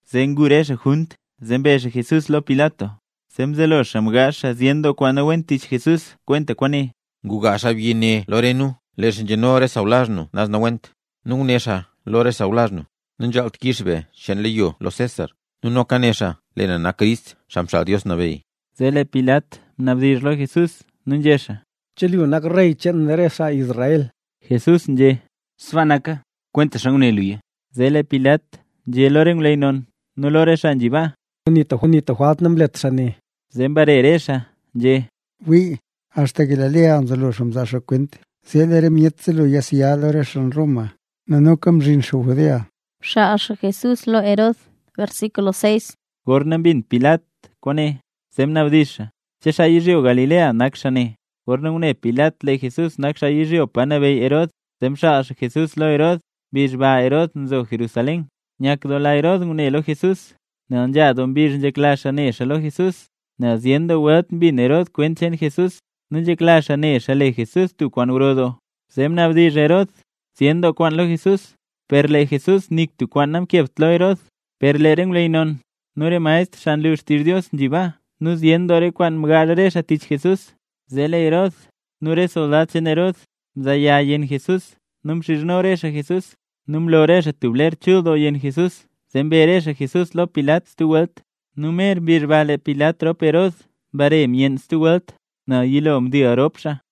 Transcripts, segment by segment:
Zee ngu re xaa junt zee mbe Jesús lo Pilat. Zee mzelo xaa mgaazh xaa zyen doo kwaan nawent tich Jesús kwenta kwaane: —Nguga xaabyi ne lo re nu, lee xaa nzheno re sawlazh nu naz nawent, nu nguné xaa lo re sawlazh nu: “Nanzhaalt kix be cheen leyo lo César xaa nabeyy yezh Roma”, nu noka né xaa: “Lee na nak Crist, Xaa Mxaal Dios Nabeyy”. Zee lee Pilat mnabdizh lo Jesús nu nzhé xaa: —¿Che lu nak Rey cheen re xaa Israel? Jesús nzhé: —Sbaa naka, kwentaxa nguné luya. Zee lee Pilat nzhé lo re ngwleyy non nu lo re xaa nzhi baa: —Nzak na nik tub jwalt namlet xaa ne. Zee mbare re xaa nzhé: —Wii, axta yizhyo Galilea mzelo xaa mzaa xaa kwent zee lee re myet zelo yasya lo re xaa Roma. Nu noka mzhin xaa re yezh cheen Judea nee nu sbaaka kale xaa. Gorna mbin Pilat kwaane, zee mnabdizh xaa: —¿Che xaa yizhyo Galilea nak xaa ne? Gorna ngune Pilat lee Jesús nak xaa yizhyo pa nabeyy Herod, zee mxaal xaa Jesús lo Herod. Mbizh ba Herod nzo Jerusalén. Nyakdoola Herod ngune lo Jesús, nel nzha doo mbizh nzhekla xaa ne xaa lo Jesús, nel zyen doo welt mbin Herod kwent cheen Jesús, nu nzhekla xaa ne xaa le Jesús tub kwaan gro doo. Zee mnabdizh Herod zyen doo kwaan lo Jesús, per lee Jesús nik tub kwaan namkebt lo Herod. Per lee re ngwleyy non, nu re maestr xaa nlu xtizh Dios nzhi baa nu zyen doo re kwaan mgaazh re xaa tich Jesús. Zee lee Herod nu re soldad cheen Herod mzaaya yenn Jesús nu mxizhno re xaa Jesús. Nu mlo re xaa tub ler chul doo yenn Jesús zee mbe re xaa Jesús lo Pilat stub welt. Nu mer mbizh ba lee Pilat rop Herod mbare myenn stub welt, nel yilo mdil doo rop xaa.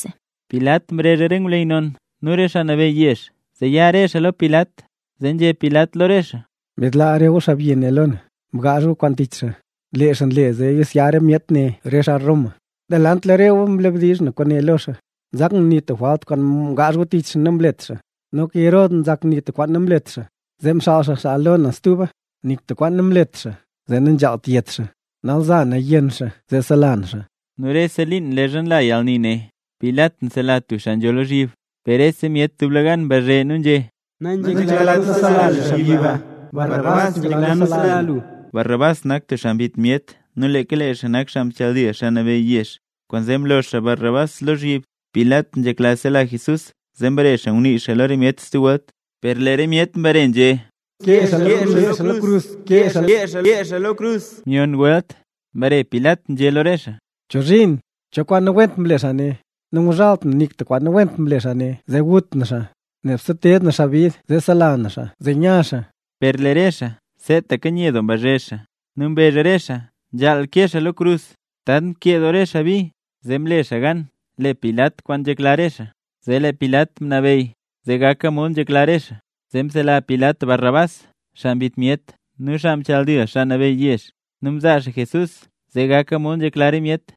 Pilat mrezh re ngwleyy non nu re xaa nabeyy yezh, zee ya re xaa lo Pilat. Zee nzhé Pilat lo re xaa: —Mbidlaa re gu xaabyi ne lo na, mgaazh gu kwaan tich xaa, lee xaa nle zee yasya re myet ne re xaa Roma. Delant lo re gu mnabdizh na re kwaane lo xaa, nzak na nik tub jwalt kwaan mgaazh gu tich xaa namlet xaa. Noka Herod nzak nik tub kwaan namlet xaa, zee mxaal xaa xaa lo na stuba. Nik tub kwaan namlet xaa zee nanzhaalt yet xaa. Nal za naya yenn xaa zee sela na xaa. Nu rese liin leezha nla yalni ne, Pilat nsela tub xaa nzho lozhyib. Per rese myet dublegan mbazhe, nu nzhé: —Nanzheklat nu sela lu xaabyi ba, Barrabás nzhekla nu sela lu. Barrabás nak tub xaa mbit myet nu leeka lee xaa nak xaa mchaldil xaa nabeyy yezh, kwaanzee mlo xaa Barrabás lozhyib. Pilat nzhekla sela Jesús, zee mbare xaa ngunii xaa lo re myet stub welt. Per lee re myet mbare nzhé: —¡Kee xaa lo krus! ¡Kee xaa lo krus! Myon welt mbare Pilat nzhé lo re xaa: —¿Chozhiin? ¿Cho kwaan nawent mle xaa ne? Nanguzhalt na nik tub kwaan nawent kwaan mle xaa zee gut na xaa, nebse teed na xaa bid zee sela na xaa zee nya xaa. Per lee re xaa seetaka nye doo mbazhe, nu mbezh re xaa nzhaal kee xaa lo krus. Tant nkee doo re xaa bi, zee mle xaa gan le Pilat kwaan nzhekla re xaa. Zee lee Pilat mnabeyy zee gaka mod nzhekla re xaa. Zee msela Pilat Barrabás xaa mbit myet nu xaa mchaldil xaa nabeyy yezh. Nu mzaa xaa Jesús zee gaka mod nzhekla re myet.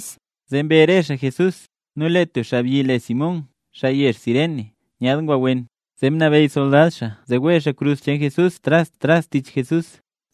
Zee mbe re xaa Jesús, nu lee tub xaabyi le Simón xaa yezh Cirene nyaad ngwa wen, zee mnabeyy soldad xaa zee wee xaa krus cheen Jesús naz tras tich Jesús.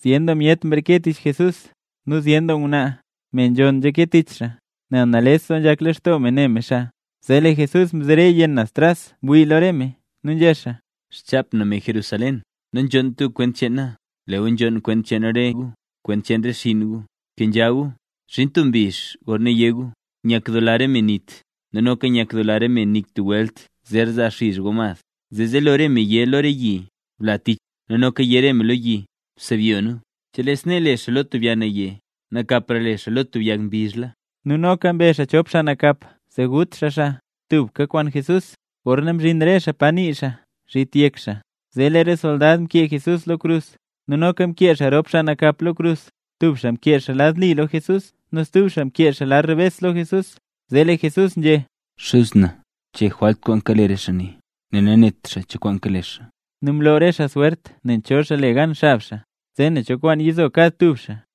Zyen doo myet mreke tich Jesús. Nu zyen doo ngwnaa, me nzhonn, nzhake tich xaa, nel nales doo nzhak lextoo me ne me xaa. Zee lee Jesús mzere yenn naz tras mwii lo re me, nu nzhé xaa: —Xchap na, me Jerusalén, nanzhonnt gu kwent cheen na, lee gu nzhonn kwent cheen re gu nu kwent cheen re xinn gu. ¡Bkenzha gu! Zhin tub mbizh gorna yé gu: “Nyakdoola re me nit, nu noka nyakdoola re me nik tub welt zer zaa nizh go mad”. Zee zelo re me yé me lo re yi: “Bla tich re nu”. Nu noka yé re me lo re yi: “Sebyo nu”. Chelee snee le xaa lo tub yag naye, nakapra le xaa lo tub yag mbizhla. Nu noka mbe xaa chop xaa nakap zee gut xaa xaa tubka kwaan Jesús. Gorna mzhin re xaa pa nii xaa “Zhit Yek Xaa”, zee lee re soldad mkee Jesús lo krus, nu noka mkee xaa rop xaa nakap lo krus; tub xaa mkee xaa lad li lo Jesús nu stub xaa mkee xaa lad rebes lo Jesús. Zee lee Jesús nzhé: —Xuz na, chee jwalt kwaan kale re xaa ne, nel nanet xaa cho kwaan kale xaa. Nu mloo re xaa swert nen cho xaa le gan xab xaa, zee nen cho kwaan yizo kad tub xaa.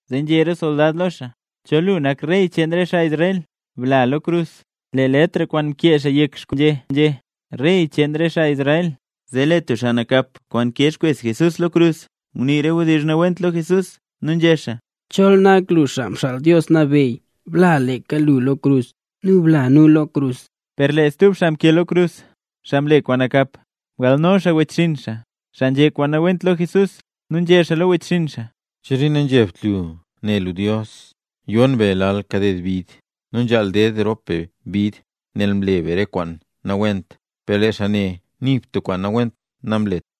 Zee nzhé re soldad lo xaa: —Chol lu nak Rey cheen re xaa Israel, bla lo krus. Lee letr kwaana mkee xaa yek xkrus xaa nzhé: “REY CHEEN RE XAA ISRAEL”. Zee lee tub xaa nakap nkee xkwes Jesús lo krus, ngunii re wdizh nawent lo Jesús, nu nzhé xaa: —Chol nak lu Xaa Mxaal Dios Nabeyy, bla lu leeka lu lo krus, nu bla nu lo krus. Per lee stub xaa mkee lo krus, xaa mle kwaan nakap, mgalno xaa wechxinn xaa, xaa nzhé kwaan nawent lo Jesús, nu nzhé xaa lo wechxinn xaa: —¿Chozhiin nanzhebt lu ne lu Dios? Yon be lal kaded bid. Nu nzhaal ded rop be bid nel mle be re kwaan nawent, per lee xaa ne nik tub kwaan nawent namlet.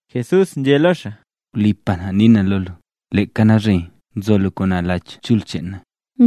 Jesús nzhé lo xaa: —Wlipa na nii na lo lu, leeka nalzhe zo lu kwaan na lo Lach Chul cheen na.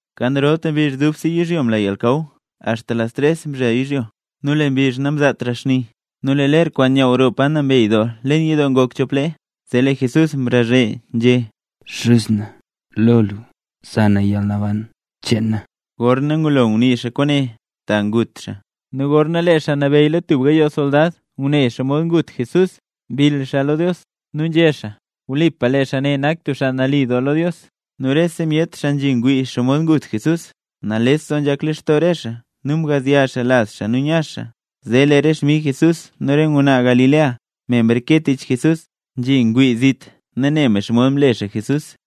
Kan rolta mbizh dubse yizhyo mla yalnakaw axta las tres mzhel yizhyo. Nu lee mbizh namzaatra xni. Nu lee ler kwaan nyaaw roo Pa Nambey Doo leen yidoo ngok chop lee. Zee lee Jesús mrazhe nzhé: —Xuz na, lo lu za na yalnaban cheen na. Gorna ngulo ngunii xaa kwaane ta ngut xaa. Nu gorna lee xaa nabeyy lo tub gayoo soldad ngune xomod ngut Jesús, mbill xaa lo Dios, nu nzhé xaa: —Wlipa lee xaa ne nak tub xaa nali doo. Nu rese myet xaa nzhingwii nen xomod ngut Jesús, nales doo nzhak lextoo re xaa nu mgazya xaa lazh xaa nu nya xaa. Zee re xmig Jesús nu re ngwnaa Galilea, me mreke tich Jesús, nzhingwii zit, ne xomod mle xaa Jesús.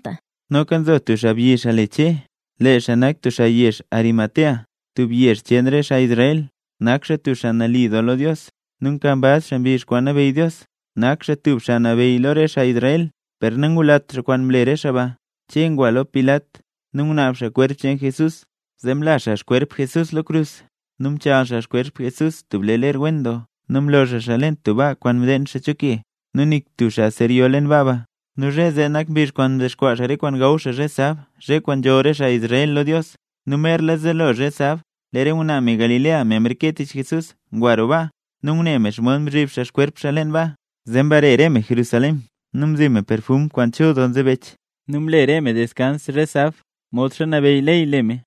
Noka nzo tub xaabyi le Che. Lee xaa nak tub xaa yezh Arimatea, tub yezh cheen re xaa Israel. Nak xaa tub xaa nali doo lo Dios, nu nkambaz xaa mbizh kwaan nabeyy Dios. Nak xaa tub xaa lo re xaa nabeyy lo xaa Israel, per nangulat xaa kwaan mle re xaa ba. Che ngwa lo Pilat nu ngunaab xaa kwerp cheen Jesús. Zee mla xaa xkwerp Jesús lo krus, nu mchaal xaa xkwerp Jesús tub lee ler wen doo nu mlo xaa xaa leen tub baa kwaan mdeen xaa cho ke. Nu nik tub xaa zer yo leen baa ba. Nu zhe zee nak mbizh kwaan ndexkwaa xaa re kwaan gaw xaa zhe sab, zhe kwaan nzholl re xaa Israel lo Dios, nu merla zelo zhe sab. Lee re ngwnaa me Galilea, me mreke tich Jesús, ngwa roo baa. Nu ngune me xomod mzhiib xaa xkwerp Jesús leen baa. Zee mbare re me Jerusalén, nu mzi me perfum kwaan chul doo nzebech. Nu mle re me deskans zhe sab, modxa nabeyy ley le me.